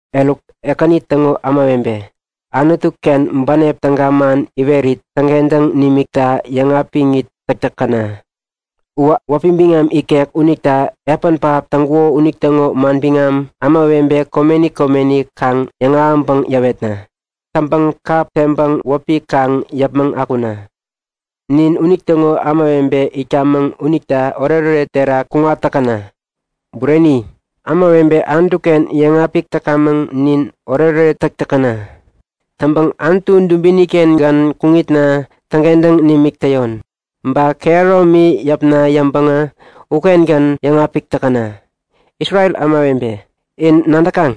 Eruk, Ekäni täŋo ämawebe, Anutu-kengän bänep täga man iwerit täŋkentäŋ nimikta yäŋapik täk täkäna! Uwä wäpi biŋam ikek unita epän pähap täŋkuko unitäŋo manbiŋam ämawebe komeni komeni kaŋ yäŋahäŋpäŋ yäwetna. Täŋpäŋ kap teŋpäŋ wäpi kaŋ yäpmäŋ akuna. Nin unitäŋo ämawebe itkamäŋ unita oretoret terak kuŋat täkäna. Bureni! Ämawebe Anutuken yäŋapik täkamäŋ nin, oretoret täk täkäna! Täŋpäŋ Anutu dubini-kengän kuŋitna täŋkentäŋ nimik täyon. Ba kehäromi yäpna yäŋpäŋä ukengän yäŋapik täkäna. Isrel ämawebe, in nadäkaŋ?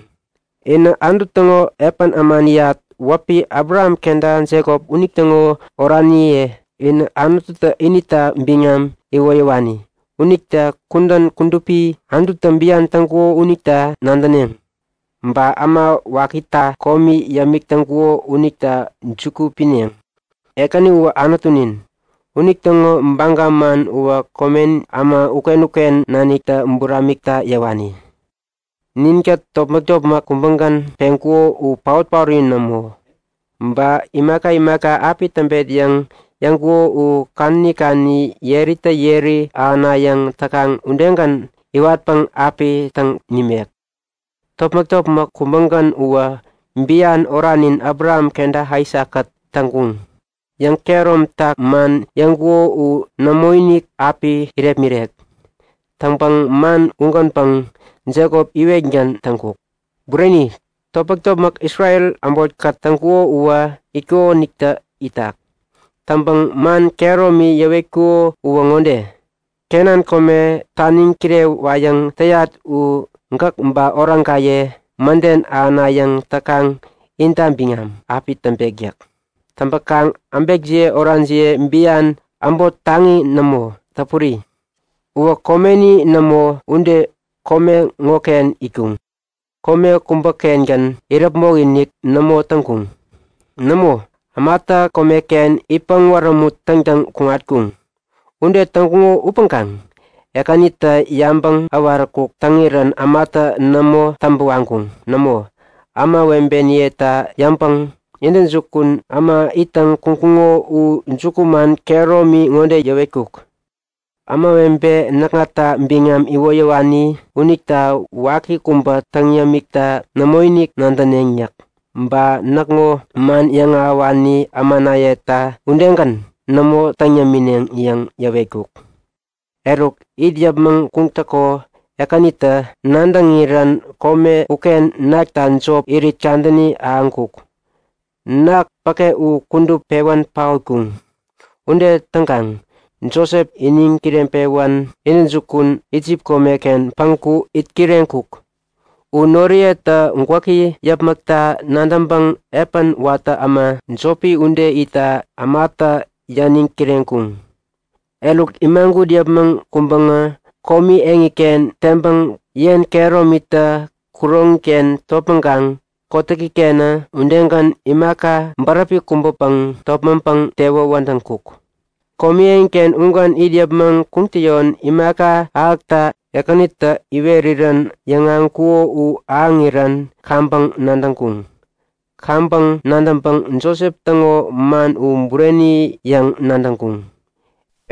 Inä Anutu täŋo epän ämaniyat wäpi Abraham kenta Jekop unitäŋo oraniye. Inä Anututä inita biŋam iwoyäwani. Unita kudän kudupi Anututä bian täŋkuko unita nadäneŋ. Ba äma wakita komi yämik täŋkuko unita juku pineŋ. Ekäni uwä Anutunin. Unitäŋo baga man uwä komen äma uken-uken naniktä buramikta yäwani. Ninkät topmäk-topmäk kubägän peŋkuko u paot-paori nämo. Ba imaka imaka api täŋ tamet yäŋ yäŋkuko u kadäni kadäni yeritä yeri ahänayäŋ täkaŋ udegän iwatpäŋ api täŋ nimek. Topmäk-topmäk kubägän uwä bian oranin Abraham kenta Aisakkät täŋkuŋ. Yäŋ-kehäromtak man yäŋkuko u nämoinik api irepmirek. Täŋpäŋ man ugänpäŋ Jekop iwetgän täŋkuk. Bureni, topmäk-topmäk Isrel äbotkät täŋkuko uwä itkukonitä itak. Täŋpäŋ man kehäromi yäwetkuko uwä ŋode; Kenan kome taniŋ kirewayäŋ täyat u gäk ba oraŋkaye mäden ahänayäŋ täkaŋ inta biŋam api täŋpek yäk. Täŋpäkaŋ äbekniye oraniye bian äbot taŋi nämo, täpuri. Uwä komeni nämo ude kome ŋoken itkuŋ. Kome kubäkengän iräpmok-inik nämo täŋkuŋ. Nämo, ämatä komeken itpäŋ wärämut täŋtäŋ kuŋatkuŋ. Ude täŋkuŋo upäŋkaŋ Ekänitä yabäŋ äwaräkuk täŋirän ämatä nämo täŋpä waŋkuŋ. Nämo, ämawebeniyeta yäŋpäŋ intäjukun äma ittäŋ kuŋkuŋo u jukuman kehäromi ŋode yäwetkuk; Ämawebe näkŋata biŋam iwoyäwani unita waki kubä täŋ yämikta nämoinik nadäneŋ yäk. Ba näkŋo man yäŋahäwani ämanayeta udegän nämo täŋ yämineŋ yäŋ yäwetkuk. Eruk, it yäpmäŋ kuŋtäko Ekänitä nadäŋirän kome uken nakta jop irit kadäni ahäŋkuk. Ketem päke u kudup pewän paotkuŋ. Ude täŋkaŋ Josep iniŋ kireŋpewän intäjukun Isip komeken päŋku itkireŋkuk. U noriyetä gwäki yäpmäkta nadäŋpäŋ epän watä äma jopi ude itta ämata yäniŋ kireŋkuŋ. Eruk, imagut yäpmäŋ kuŋpäŋä komi eŋiken teŋpäŋ yen kehäromitä kuroŋiken topmäŋkaŋ kotäkikenä udegän imaka bäräpi kubäpäŋ topmäŋpäŋ tewä wädäŋkuk. Komi eŋiken ugän it yäpmäŋ kuŋtäyon imaka ahäkta Ekänitä iwerirän yäŋahäŋkuko u ahäŋirän kaŋpäŋ nadäŋkuŋ. Kaŋpäŋ nadäŋpäŋ Josep täŋo man u bureni yäŋ nadäŋkuŋ.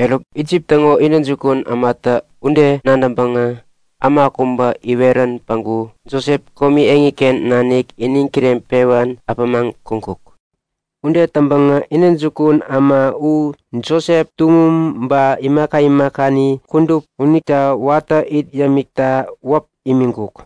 Eruk, Isip täŋo intäjukun ämatä ude nadäŋpäŋä äma kubä iwerän päŋku Josep komi eŋiken nanik iniŋ kireŋpewän äpämaŋ kuŋkuk. Ude täŋpäŋä intäjukun äma u Josep tuŋum ba imaka imakani kudup unita watä it yämikta wäp imiŋkuk.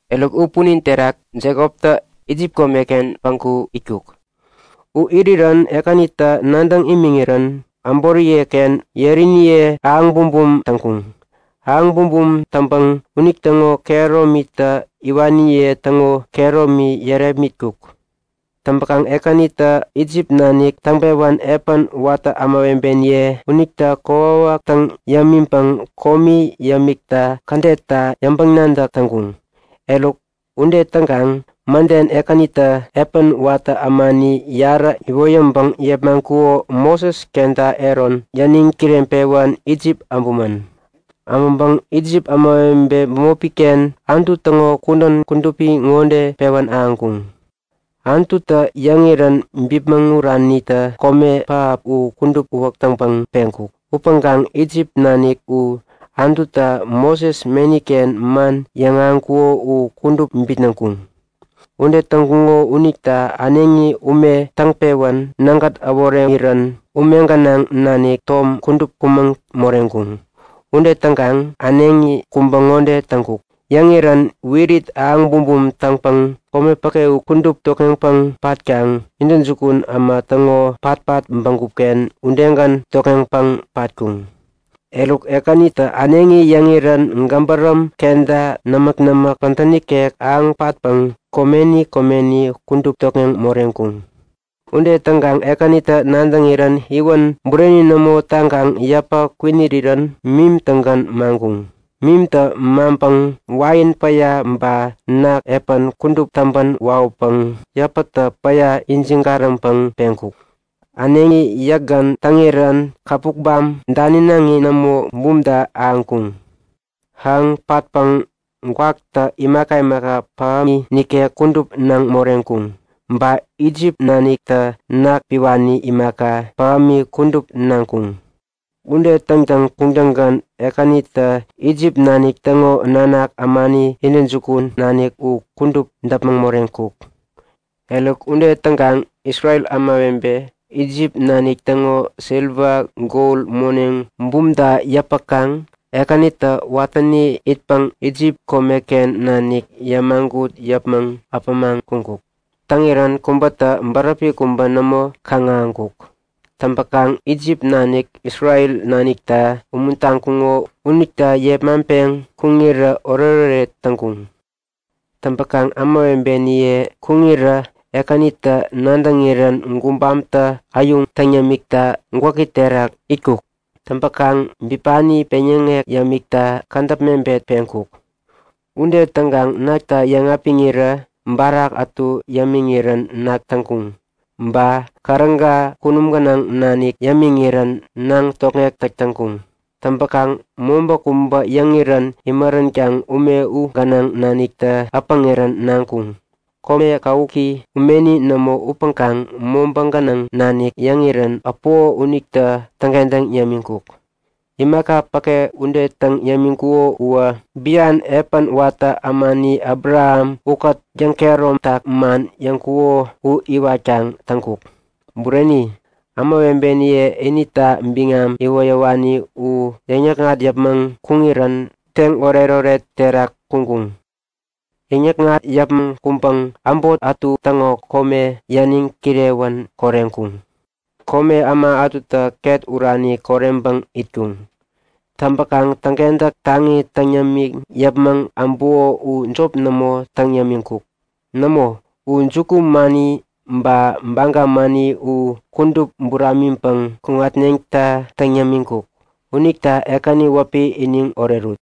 Eruk, u punin terak, Jekoptä Isip komeken päŋku itkuk. U irirän Ekänitä nadäŋ imiŋirän äboriyeken yeriniye ahäŋ bumbum täŋkuŋ. Ahäŋ bumbum täŋpäŋ unitäŋo kehäromitä iwaniye täŋo kehäromi yärepmitkuŋ. Täŋpäkaŋ Ekänitä Isip nanik täŋpewän epän watä ämawebeniye unita kokwawak täŋ yämiŋpäŋ komi yämikta kädetta yäŋpäŋ-nadäk täŋkuŋ. Eruk ude täŋkaŋ mäden Ekänitä epän watä ämani yarä iwoyäŋpäŋ yepmaŋkuko Moses kenta Aron yäniŋ kireŋpewän Isip äbumän. Äbäŋpäŋ Isip ämawebe bämopiken Anutu täŋo kudän kudupi ŋode pewän ahäŋkuŋ; Anututä yäŋirän bipmäŋ uranitä kome pähap u kudup uwäk täŋpäŋ peŋkuk. Upäŋkaŋ Isip nanik u Anututä Moses meniken man yäŋahäŋkuko u kudup bitnäŋkuŋ. Ude täŋkuŋo unita äneŋi ume täŋpewän nägät äworeŋirän ume gänaŋ nanik tom kudup kumäŋ moreŋkuŋ. Ude täŋkaŋ äneŋi kubä ŋode täŋkuk; Yäŋirän wirit ahäŋ bumbum täŋpäŋ kome päke u kudup tokŋeŋpäŋ patkaŋ, intäjukun äma täŋo patpat bägupken udegän tokŋeŋpäŋ patkuŋ. Eruk Ekänitä äneŋi yäŋirän gäbäräm kenta nämäk-nämäk pädä nikek ahäŋ patpäŋ komeni komeni kudup tokŋeŋ moreŋkuŋ. Ude täŋkaŋ Ekänitä nadäŋirän iwän bureni nämo taŋkaŋ yäpä kwinirirän mim-tägän maŋkuŋ. Mimtä maŋpäŋ wain päya ba ketemi epän kudup täŋpän wawäpäŋ yäpätä päya ijiŋ-gariŋpäŋ peŋkuk. Äneŋi yäkgän täŋirän käpukbam daninaŋi nämo, bumta ahäŋkuŋ. Ahäŋ patpäŋ gwaktä imaka pähämi nikek kudup naŋ moreŋkuŋ. Ba Isip naniktä ketem piwani imaka, pähämi kudup naŋkuŋ. Ude täŋtäŋ kuŋtäŋgän Ekänitä Isip nanik täŋo nanak ämani intäjukun nanik u kudup däpmäŋ moreŋkuk. Eruk, ude täŋkaŋ Isrel ämawebe Isip nanik täŋo siliwa gol moneŋ bumta yäpäkaŋ Ekänitä watäni itpäŋ Isip komeken nanik yämagut yäpmäŋ äpämaŋ kuŋkuk. Täŋirän kubätä bäräpi kubä nämo kaŋ-ahäŋkuk. Täŋpäkaŋ Isip nanik Isrel nanikta umuntaŋkuŋo unita yepmaŋpeŋ kuŋirä oretoret täŋkuŋ. Täŋpäkaŋ ämawebeniye kuŋirä Ekänitä nadäŋirän gubamtä äyuŋ täŋ yämikta gwäki terak itkuk. Täŋpäkaŋ bipani peŋyäŋek yämikta kädäp mebet peŋkuk. Ude täŋkaŋ ketemta yäŋapiŋirä barak ätu yämiŋirän nak täŋkuŋ. Ba käräga kunum gänaŋ nanik yämiŋirän naŋ tokŋek täk täŋkuŋ. Täŋpäkaŋ mobä kubä yäŋirän imäränkaŋ ume u gänaŋ naniktä äpäŋirän naŋkuŋ. Kome kawuki umeni nämo upäŋkaŋ mobä gänaŋ nanik yäŋirän äpuko unitä täŋkentäŋ yämiŋkuk. Imaka päke ude täŋ yämiŋkuko uwä bian epän watä ämani Abraham ukät yäŋkehäromtak man yäŋkuko u iwatkaŋ täŋkuk. Bureni, ämawebeniye inita biŋam iwoyäwani u yäŋ-yäkŋat yäpmäŋ kuŋirän teŋ oretoret terak kuŋkuŋ. Yäŋ-yäkŋat yäpmäŋ kuŋpäŋ äbot ätu täŋo kome yäniŋ kirewän koreŋkuŋ. Kome äma ätutä ket urani koreŋpäŋ itkuŋ. Täŋpäkaŋ täŋkentäk taŋi täŋ yämiŋ yäpmäŋ äbuko u jop nämo täŋ yämiŋkuk. Nämo, u jukumani ba baga mani u kudup buramiŋpäŋ kuŋatneŋta täŋ yämiŋkuk. Unita Ekäni wäpi iniŋ orerut!